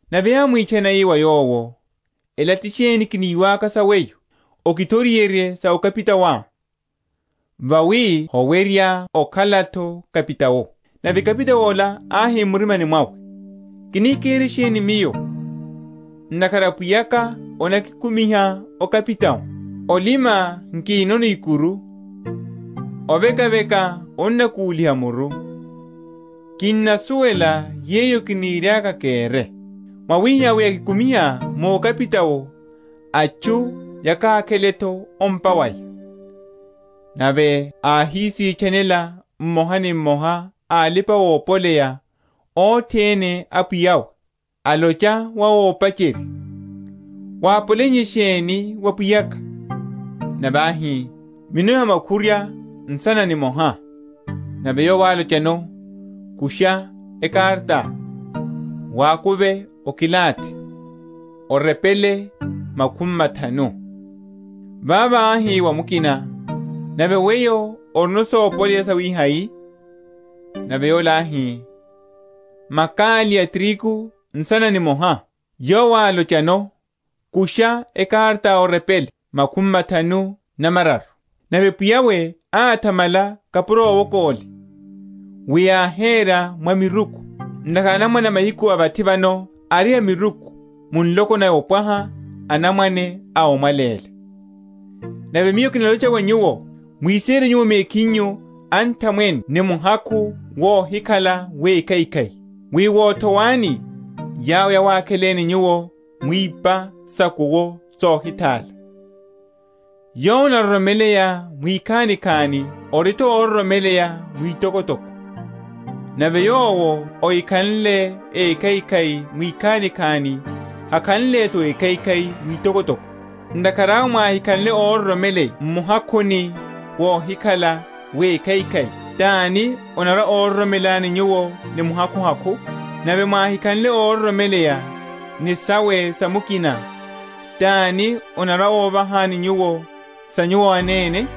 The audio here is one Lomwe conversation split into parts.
Nave ámwitchana, ii wa yowo, Ela ti sheni kiniwaka sa weyo? Okithoriherye sa okapitaoá; vawi howerya okhala’tho kapitao. Nave kapitao ola áhi m’murimani mwawe, Kini kere sheni miyo, ntakhara pwiya’ka anakikumiha‐okapitao? olima nkinono ikuru, ovekaveka onnakuliha muru. Kinnasuwela yeyo kiniriaka kere, wawihihá wi akikumiha mu okapitao, atchu yakakhele’tho o’mpa waya. Nave áhisitchanela mmoha ni mmoha a alipa‐opoleya othene a pwiya’we, alocha wa ópacherya, Wápoleiye sheni wa pwiya’ka? Nave áhi, Mino ya makhurwa nsana nimoha. Nave yowo álochano, Kusha ekaratá, wakuve okilathi, orepele, makhumi mathanu. Vavo áhi wa mukina, Nave weyo orino sopoleya sawihai? Nave yola áhi, Makali a tirigu nsana nimoha. Yowo álochano, Kusha ekaratá orepele makhumi mathanu na mararu. Nave pwiya’we áthamala kapuro owoka ole, wi áhera mwa miruku; ntakhara anamwane a mahiku a vathi vano ari a miruku mu nloko naya opwaha anamwane a omwaléla. Nave Miyo kinalocha wa nyuwo, Mwisere nyuwo mekhinyu anthamwene ni muhakhu wohikhala wekhaikhai; wi wothowani, yawo yawakheleni nyuwo mu ipa sa’kuwo sohithála. Yowo anaroromeleya mwikhanikhani ori’tho ororomeleya mwitokotoko; nave yowo ahikhanle ékhaikhai mwikhanikhani hakhanle’tho ékhaikhai mwitokotoko. Ntakhara awe mwáhikhanle óroromeleya m’muhakhuni wohikhala wekhaikhai, tani anarwa‐ororomelani nyuwo ni muhakhuhakhu? Nave mwáhikhanle óroromeleya ni sawe sa mukina, tani anarwa‐ovahani nyuwo sa nyuwo anene?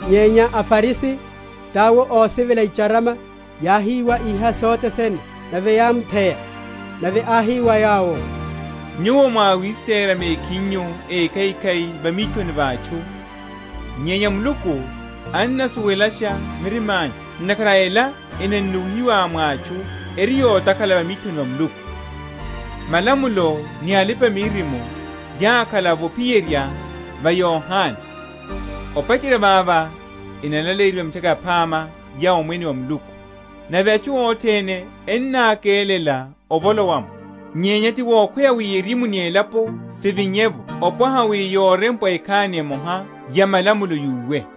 Nyenya aFarisi, tawo ósivela icharama, yáhiwa iha sothe sene; nave yámutheya. Nave áhi wa yawo, Nyuwo, mwá awisera mekhinyu ékhaikhai va mithoni va atchu; nyenya Muluku annasuwelasha mirima’nyu; ntakhara ela enannuwihiwa mwa atchu eri yotakhala va mithoni va Muluku. Malamulo ni alipa‐miririmo yákhala’vo ophiyerya va Yohane; opacherya vavo enalaleyiwa Mitchaka Yaphama ya Omwene wa Muluku, nave atchu othene ennákelela ovolowa’mo. Nyenya ti wokhweya wi erimu ni elapo sivinye’vo opwaha wi yorempwa ekhani emoha ya malamulo yúwe.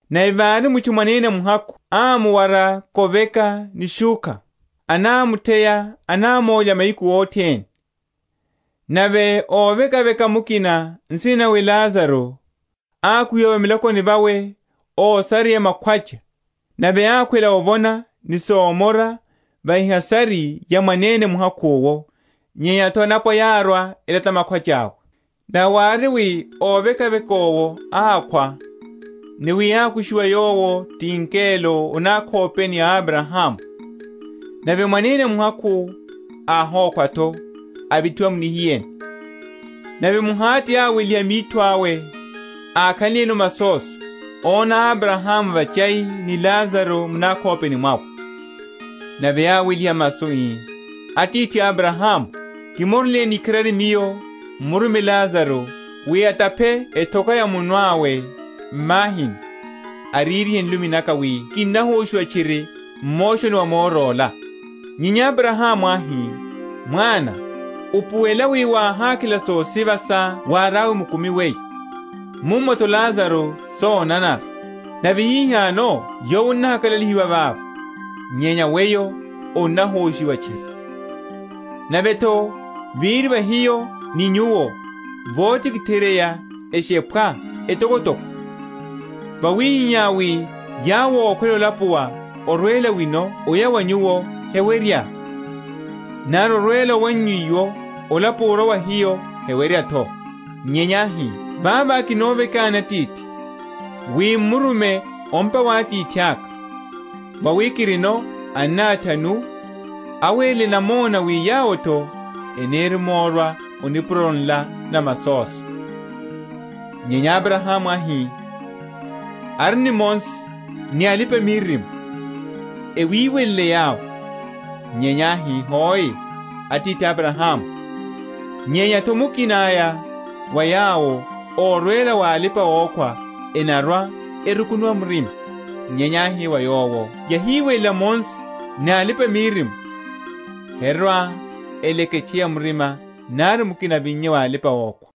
Nave vári mutchu mwanene muhakhu ámuwara koveka ni shúkha, anámutheya, anámólya mahiku othene; nave óvekaveka mukina, nsina nawe Lazaro, ákuhiwa va milakoni vawe ósareya makhwacha, nave ákhwela ovona ni somora va ehasari ya mwanene muhakhu’wo; nyenya’tho anapwa yárwa elata makhwacha’we. Nave wári wi óvekaveka owo ákhwa, ni wi ákushiwa yowo ti angelo o nakhopeni a Abrahamu; nave mwanene muhakhu’wo áhokhwa’tho, avithiwa mu nihiyeni. Nave m’Hade áweliha mitho awe, ákhanliyeno masoso, óna Abrahamu vachai, ni Lazaro mu nakhopeni mwawe. Nave áweliha masu ii, Atithi Abrahamu, kimoreleni ikharari miyo, m’murume Lazaro, wi ataphe ethoka ya munwe awe m’mahini, ariryihe nlumi naka; wi kinnahoshiwa tchiri m’moshoni wa moro ola. Nyenya Abrahamu áhi, Mwana, upuwela wi wáhakhela sosiva sá wáriá mukumi weyo, mummo’tho Lazaro sonanara; nave hihano yowo annahakalalihiwa vava, nyenya weyo onnahoshiwa tchiri. Nave’tho, véri va hiyo ni nyuwo votikitheryeya eshephwa etokotoko, wawihihá wi yawo ókhwela olapuwa orwela wino oya wa nyuwo hewerya, nari orwela owannyu iwo olapuwa orwa wa hiyo, hewerya’tho. Nyenya áhi, Vavo kinovekani, Atithi, wi m’murume o’mpa wa atithaka; vawi kirino anna athanu; awerele namona wi yawo’tho enirimorwa o nipuroni nla na masoso. Nyenya Abrahamu áhi, Ari ni Mose ni alipa‐miririmo; ewiwelele yawo. Nyenya áhi, Hoe, Atithi Abrahamu, nyenya’tho mukina aya wa yawo órwela wa alipa‐okhwa enarwa‐erukunuwa murima. Nyenya áhi wa yowo Yáhiwelela Mose ni alipa‐miririmo, herwa‐eleketcheya murima nari mukina avinnye wa alipa‐okhwa.